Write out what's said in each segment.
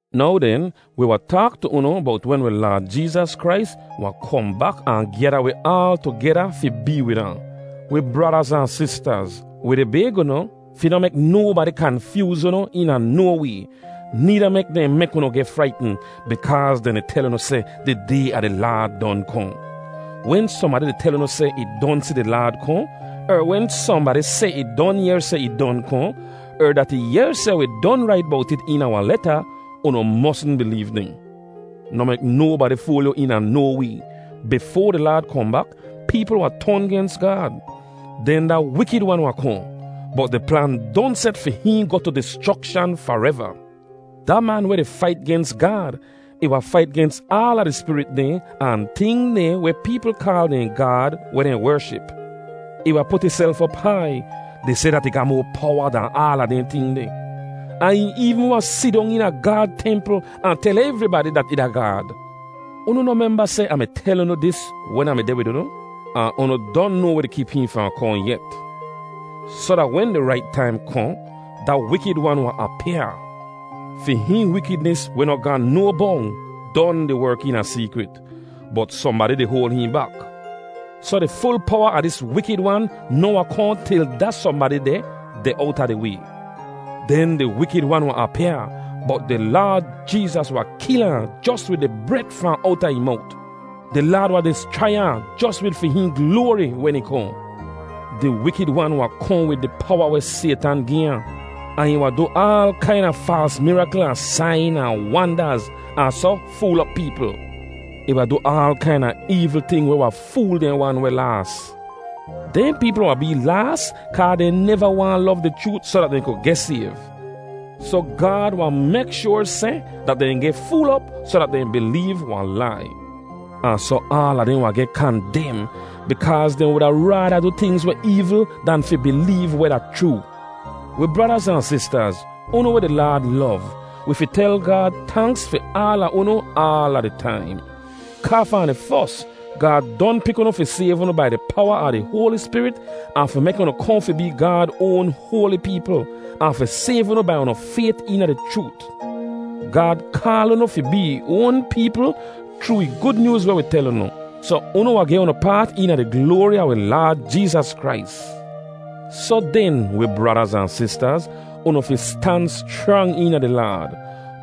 Now den, wi wahn taak tu unu bowt wen wi Laad Jeezas Krais wahn kohn bak ahn gyada wi aal tugeda fi bee wid ahn. Wi bradaz ahn sistaz, wi di bayg unu, fi noh mek nobadi kanfyooz unu eena no way, needa mek dehn mek unu geh fraitn bikaaz dehn di tel unu seh di Day a di Laad don kohn. Wen sohnbadi di tel unu seh ih don si di Laad kohn, er wen sohnbadi seh ih don yehr seh ih don kohn, er dat ih yehr seh wi don rait bowt it eena wahn leta, unu mosn bileev dehn. Noh mek nobadi fool yu eena no way. Bifoa di Laad kohn bak, peepl wahn ton gens Gaad. Den da Wikid Wan wahn kohn, bot di plan don set fi hihn goh tu dischrokshan fareva. Da man weh di fait gens Gaad, ih wahn fait gens aala di spirit dehn ahn ting dehn weh peepl kaal dehn gaad weh dehn wership. Ih wahn put ihself op hai, di seh dat ih ga moa powa dahn aala dehn ting deh. Ahn ih eevn wahn sidong eena Gaad templ ahn tel evribadi dat ih da Gaad. Unu noh memba seh Ah mi tel unu dis wen Ah mi deh wid unu? Ahn unu don noa weh di kip hihn fahn kohn yet; soh da wen di rait taim kohn, da Wikid Wan wahn apyaa. Fi hihn wikidnis weh noh ga no bong don di werk eena seekrit, bot sohnbadi di hoal hihn bak. Soh di ful powa a dis Wikid Wan noh wahn kohn til da sohnbadi deh, deh owta di way. Den di Wikid Wan wahn apyaa bot di Laad Jeezas wahn kil ahn jos wid di bret fahn owta ih mowt. Di Laad wahn dischrai ahn jos wid fi hihn gloari wen ih kohn. Di Wikid Wan wahn kohn wid di powa weh Saytan gi ahn, ahn ih wahn du aal kaina faals mirakl ahn sain ahn wandaz, ahn soh fool op peepl. Ih wahn du aal kaina eevl ting weh wahn fool dehn wan weh laas. Dehn peepl wahn bee laas kaa dehn neva waahn lov di chroot soh dat dehn ku geh sayv. Soh Gaad wahn mek shoar seh dat dehn geh fool op soh dat dehn bileev wahn lai. Ahn soh aala dehn wahn geh kandem bikaaz dehn wuda raada du tingz weh eevl dan fi bileev weh da chroo. Wi bradaz ahn sistaz, unu weh di Laad lov, wi fi tel Gaad tanks fi aala unu aala di taim. Kaa fahn di fos, Gaad don pik unu fi sayv unu bai di powa a di Hoali Spirit ahn fi mek unu kohn fi bee Gaad oan hoali peepl, ahn fi sayv unu bai unu fayt eena di chroot. Gaad kaal unu fi bee ih oan peepl chroo ih Gud Nyooz weh wi tel unu, soh unu wahn geh unu paat eena di gloari a wi Laad Jeezas Krais. Soh den, wi bradaz ahn sistaz, unu fi stan schrang eena di Laad.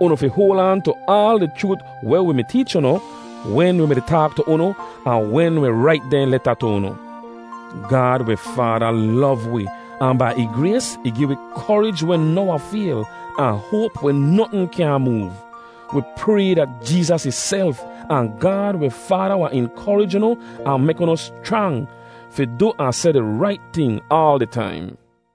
Unu fi hoal aan tu aal di chroot weh wi mi teech unu, wen wi mi-di taak tu unu ahn wen wi rait dehn leta tu unu. Gaad wi Faada lov wi ahn bai ih grays ih gi wi korij weh noh wahn fayl, ahn hoap weh notn kyaahn moov. Wi pray dat Jeezas ihself, ahn Gaad wi Faada wahn inkorij unu ahn mek unu schrang, fi du ahn seh di rait ting aal di taim.